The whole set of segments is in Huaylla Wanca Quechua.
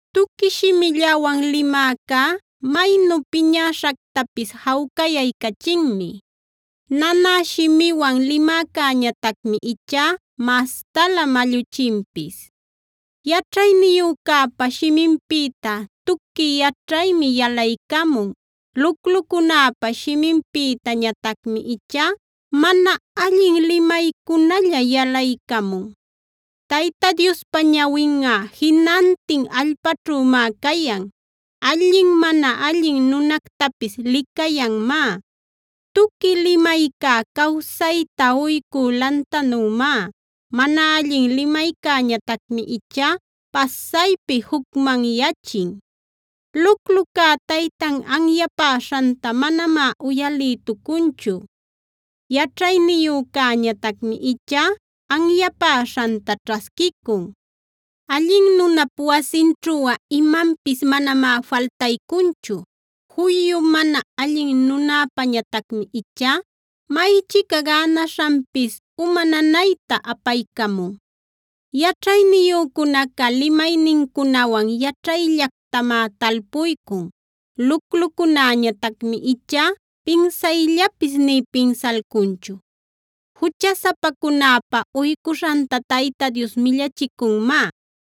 Tuqui shimillawan limäcá maynu piñäśhactapis jawcayaycachinmi; nanä shimiwan limäcäñatacmi ichá mastalä malluchinpis. Yaćhayniyücäpa shiminpïta tuqui yaćhaymi yalaycamun; luclucunäpa shiminpïtañatacmi ichá mana allin limaycunalla yalaycamun. Tayta Diospa ñawinꞌa jinantin allpäćhümá cayan; allin mana allin nunactapis licayanmá. Tuqui limayca cawsayta uycü lantanümá; mana allin limaycäñatacmi ichá pasaypi jucmanyachin. Luclucá taytan anyapäśhanta manamá uyalïtucunchu; yaćhayniyücäñatacmi ichá anyapäśhanta ćhasquicun. Allin nunap wasinćhuꞌa imanpis manamá faltaycunchu; juyu mana allin nunäpañatacmi ichá maychica gänaśhanpis uma nanayta apaycamun. Yaćhayniyücunaca limaynincunawan yaćhayllactamá talpuycun; luclucunäñatacmi ichá pinsayllapis nï pinsalcunchu. Juchasapacunäpa uycuśhanta Tayta Dios millachicunmá;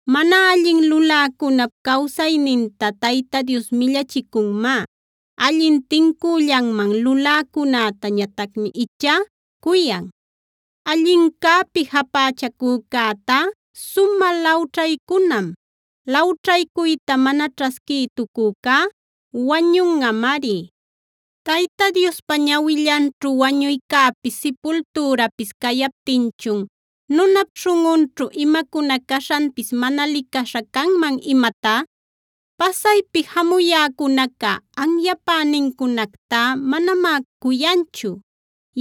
Mana allin luläcunap cawsayninta Tayta Dios millachicunmá; allin tincüllanman luläcunätañatacmi ichá cuyan. Allincäpi japächacücätá sumä lawćhaycunam; lawćhaycuyta mana ćhasquïtucücá wañunꞌamari. Tayta Diospa ñawillanćhu wañuycäpis sipultürapis cayaptinchun, ¿nunap śhunꞌunćhu imacuna caśhanpis mana licaśha canman imatá? Pasaypi jamuyäcunaca anyapänincunactá manamá cuyanchu;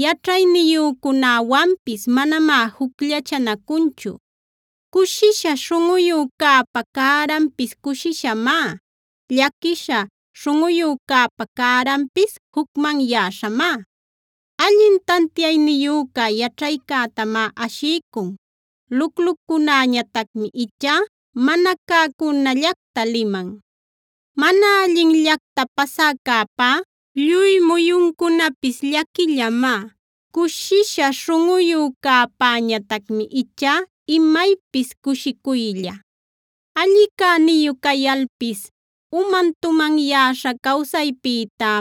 yaćhayniyücunäwanpis manamá jucllachanacunchu. Cushisha śhunꞌuyücäpa cäranpis cushishamá; llaquisha śhunꞌuyücäpa cäranpis jucmanyäśhamá. Allin tantiayniyüca yaćhaycätamá ashiycun; luclucunäñatacmi ichá mana cäcunallacta liman. Mana allinllacta pasäcäpá lluy muyuncunapis llaquillamá; cushisha śhunꞌuyücäpäñatacmi ichá imaypis cushicuylla. Alli cäniyu cayalpis uman tumanyäśha cawsaypïtá,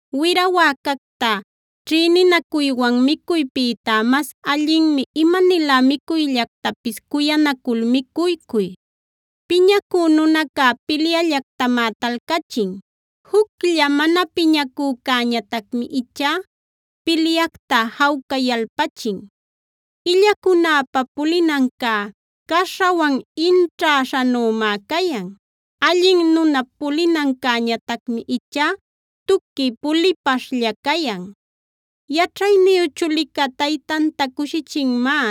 Wira wäcacta ćhïninacuywan micuypïtá mas allinmi imanilä micuyllactapis cuyanacul micuycuy. Piñacü nunaca pilyallactamá talcachin; juclla mana piñacücäñatacmi ichá pilyacta jawcayalpachin. Illacunäpa pulinancá caśhawan inćhaśhanumá cayan; allin nunap pulinancäñatacmi ichá tuqui pulipaśhlla cayan. Yaćhayniyu chulica taytanta cushichinmá;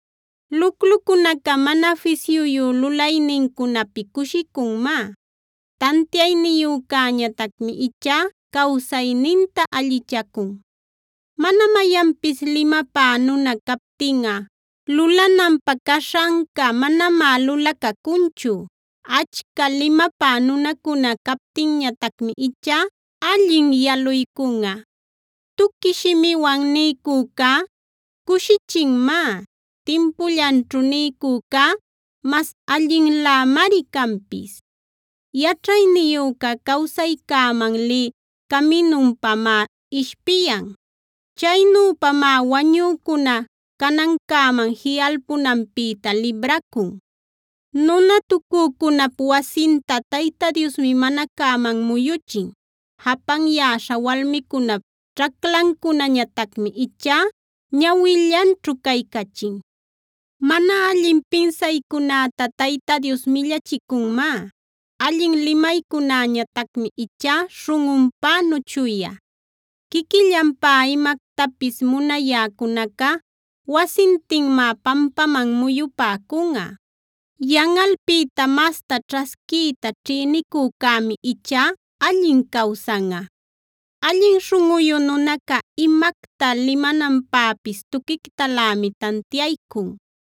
Luclucunaca mana fisyuyu lulaynincunapi cushicunmá; tantiayniyücäñatacmi ichá cawsayninta allichacun. Mana mayanpis limapä nuna captinꞌa lulananpä caśhanca manamá lulacacunchu; achca limapä nunacuna captinñatacmi ichá allin yaluycunꞌa. Tuqui shimiwan niycücá cushichinmá; timpullanćhu niycücá mas allinlämari canpis. Yaćhayniyüca cawsaycäman lï caminupamá ishpiyan; chaynüpamá wañücuna canancäman jiꞌalpunanpïta libracun. Nunatucücunap wasinta Tayta Diosmi mana cäman muyuchin; japanyäśha walmicunap ćhaclancunactañatacmi ichá ñawillanćhu caycachin. Mana allin pinsaycunäta Tayta Dios millachicunmá; allin limaycunäñatacmi ichá śhunꞌunpänu chuya. Quiquillanpä imactapis munayäcunaca wasintinmá pampaman muyupäcunꞌa; yanꞌalpïta masta ćhasquiyta ćhïnicücämi ichá allin cawsanꞌa. Allin śhunꞌuyu nunaca imacta limananpäpis tuquictalämi tantiaycun;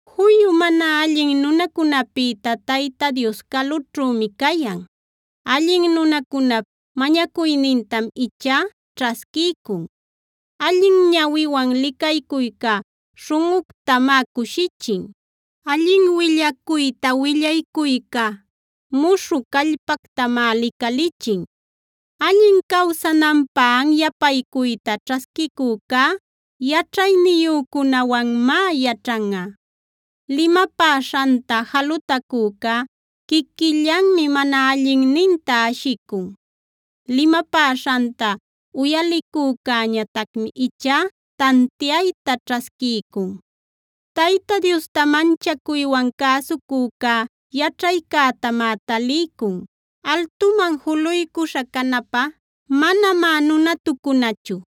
Juyu mana allin nunacunäpïta Tayta Dios calućhümi cayan; allin nunacunap mañacuynintam ichá ćhasquiycun. Allin ñawiwan licaycuyca śhunꞌuctamá cushichin; allin willacuyta willaycuyca muśhü callpactamá licalichin. Allin cawsananpä anyapaycuyta ćhasquicücá yaćhayniyücunäwanmá yaćhanꞌa. Limapäśhanta jalutacücá quiquillanmi mana allinninta ashicun; limapäśhanta uyalicücäñatacmi ichá tantiayta ćhasquiycun. Tayta Diosta manchacuywan cäsucücá yaćhaycätamá taliycun; altuman juluycuśha canapä manamá nunatucunachu.